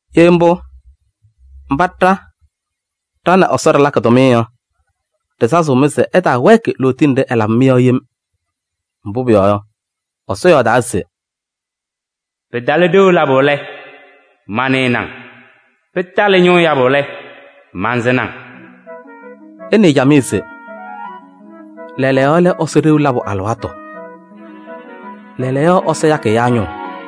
Ye mbʋ, mba ɖa ɖa nɛ Ɛsɔ ɖɩlakɩ tʋmɩyɛ yɔ, ɖɩsazɩɣ-mɩ se ɩtaawɛɛkɩ lootiye nɖɩ ɛlabɩ-mɩ yɔ yem. Mbʋ pʋyɔɔ yɔ, Ɛsɔ yɔɔdaa se: “Pɩtalɩ ɖeu labʋ lɛ, manɩnɩ-ŋ. Pɩtalɩ ñʋʋ yabʋ lɛ, mansɩnɩ-ŋ.” Ɩnɩɩ camɩyɛ se: lɛɛlɛɛyɔ lɛ Ɛsɔ ɖeu labʋ alɩwaatʋ. Lɛɛlɛɛyɔ ɛyakɩ ɛyaa ñʋʋ.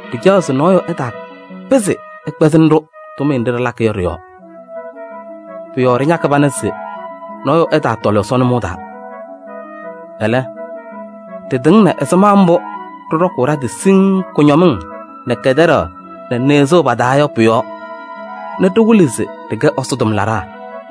Ɖɩcaɣ se nɔɔyʋ ɛtaapɩzɩ ɛkpɛzɩnɩ-ɖʋ tʋmɩyɛ nɖɩ ɖɩlakɩ yɔ ɖɩ-yɔɔ. Pʋ-yɔɔ ɖɩñakɩ pana se nɔɔyʋ ɛtaatɔlɩ Ɛsɔ nʋmɔʋ taa. Ɛlɛ, ɖɩtɩŋnɩ ɛzɩma mbʋ ɖɩɖɔkʋʋ ɖa-tɩ siŋŋ kʋñɔmɩŋ nɛ kɛtɛɖaɣ nɛ nɩɣzʋʋ pa-taa yɔ pʋ-yɔɔ nɛ ɖɩwɩlɩ se ɖɩkɛ Ɛsɔ tʋmlaɖaa.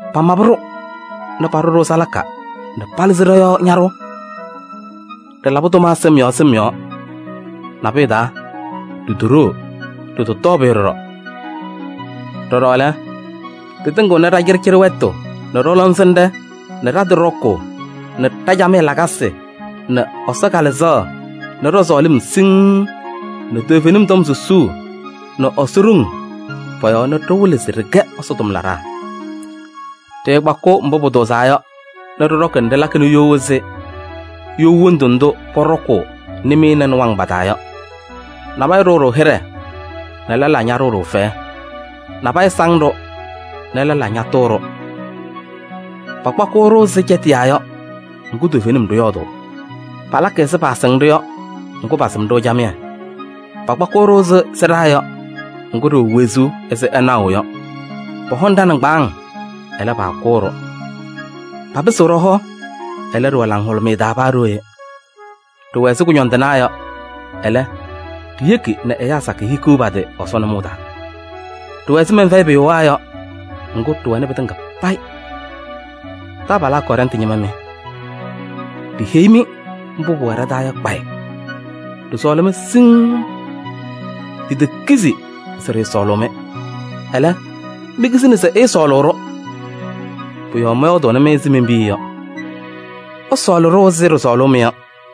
Pamabɩ-ɖʋ nɛ paɖʋ-ɖʋ salaka nɛ palɩzɩ ɖɔ-yɔɔ ñaɖʋʋ. Ɖɩlabɩ tʋma sɩm yɔɔ sɩm yɔɔ: nabʋyʋ taa, ɖitoɖoo, ɖɩtɔtɔɔ pʋyʋ ɖɔɖɔ. Ɖɔɖɔ lɛ, ɖɩtɩŋɩɣnɩ ɖa-cɩɖɩcɩɖɩ wɛtʋ nɛ ɖɔ-lɔŋsɩnɖɛ nɛ ɖa-tɩ ɖɔkʋʋ nɛ ɖa-camɩyɛ lakasɩ nɛ Ɛsɔ Kalɩzaɣ nɛ ɖɔ-sɔɔlɩm siŋŋ nɛ toovenim tɔm susuu nɛ Ɛsɔ ɖoŋ pɔ-yɔɔ nɛ ɖɩwɩlɩ se ɖɩkɛ Ɛsɔ tʋmlaɖaa. Ɖɩkpakɩɣ mbʋ pʋtʋʋzaa yɔ ɖɩɖɔkɩ nɛ ɖɩlakɩnɩ you ɛzɩ you wondu ndʋ pɔɖɔkʋʋ nɩmɩyɛ nɛ nɩwaŋ pa-taa yɔ. Nabɛyɛ ɖʋʋ-ɖʋ hɩɖɛ nɛ lɛlaa ñaɖʋʋ-ɖʋ fɛyɛ. Nabɛyɛ saŋ-ɖʋ nɛ lɛlaa ñatʋʋ-ɖʋ. Pakpakɩɣ-ɖʋ ɛzɩ cɛtɩyaa yɔ, ŋgʋ toovenim ɖɩyɔɔdʋʋ. Palakɩ ɛzɩ paasɩŋ-ɖʋ yɔ, ŋgʋ pasɩm-ɖʋ camɩyɛ. Pakpakɩɣ-ɖʋ ɛzɩ sɩɖaa yɔ, ŋgʋ ɖɩwɛ wezuu ɛzɩ ɩnaɣʋ yɔ. Pɔhɔŋ ɖa-nɩŋgbaaŋ, ɛlɛ, paakʋʋ-ɖʋ. Papɩsɩɣ ɖɔ-hɔ, ɛlɛ, ɖɩwɛ laŋhʋlʋmɩyɛ taa paa ɖooye. Ɖɩwɛ ɛzɩ kʋñɔndɩnaa yɔ, ɛlɛ, ɖiyeki nɛ ɛyaa sakɩyɛ hikiɣ pa-tɩ Ɛsɔ nʋmɔʋ taa. Ɖɩwɛ ɛzɩ mɛnfɛyɩpʋyʋwaa yɔ, ŋgʋ ɖɩwɛnɩ pɩtɩŋa payɩ. Taabalaa Kɔrɛntɩ ñɩma mɩ, ɖiheyi-mɩ mbʋ pʋwɛ ɖa-taa yɔ kpayɩ. Ɖɩsɔɔlɩ-mɩ siŋŋ. Ɖitekizi se ɖɩɩsɔɔlʋʋ-mɩ, ɛlɛ, mikizini se ɩɩsɔɔlʋʋ-ɖʋ. Pʋ-yɔɔ mɔyɔɔdʋʋnɩ-mɩ ɛzɩ men-piya yɔ: ɩsɔɔlɩ-ɖʋ ɛzɩ ɖɩsɔɔlʋʋ-mɩ yɔ.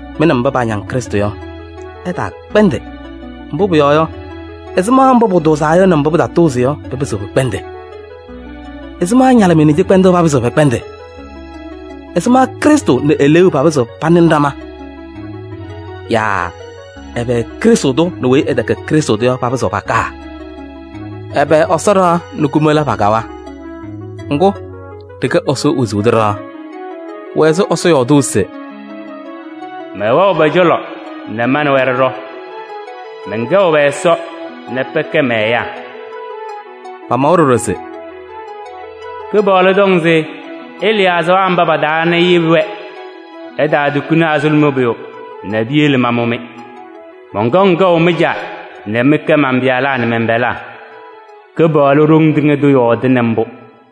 Mɩ nɛ mba paañaŋ Krɩstʋ yɔ, ɩtaakpɛndɩ. Mbʋ pʋyɔɔ yɔ, ɛzɩma mbʋ pʋtʋʋzaa yɔ nɛ mbʋ pɩtatʋʋzɩ yɔ pɩpɩzɩɣ pɩkpɛndɩ? Ɛzɩma ñalɩmɩyɛ nɛ cɩkpɛndʋʋ papɩzɩɣ pɛkpɛndɩ? Ɛzɩma Krɩstʋ nɛ Eleeu papɩzɩɣ panɩnɩ ɖama? Yaa ɛbɛ Krɩstʋ tʋ nɛ weyi ɛtɛkɛ Krɩstʋ tʋ yɔ papɩzɩɣ pakaa? Ɛbɛ Ɛsɔ ɖɩɣa nɛ kumola pakawa? Ŋgʋ, ɖɩkɛ Ɛsɔ wezuu tʋ ɖɩɣa. Pʋwɛ ɛzɩ Ɛsɔ yɔɔdʋʋ se: “Mɛwɛɣ pɔ-cɔlɔ nɛ ma nɛ wɛ ɖɩɖɔ. Mɛnkɛɣ pɛ-Ɛsɔ nɛ pɛkɛ mɛ-ɛyaa” yɔ. Pamawa ɖɔɖɔ se: “Kɩpaɣlʋ tɔŋ se ɩlɩɩ azaɣa mba pa-taa nɛ iyebi-wɛ. Ɩtaatukuni azuluma pʋyʋ nɛ piyele mamʋ-mɩ. Mɔnkɔŋ kɛʋ mɩ-Caa nɛ mɩkɛ man-pɩyalaa nɛ mɛn-pɛlaa. Kɩpaɣlʋ Ɖoŋ Tɩŋa Tʋ yɔɔdɩnɩ mbʋ.”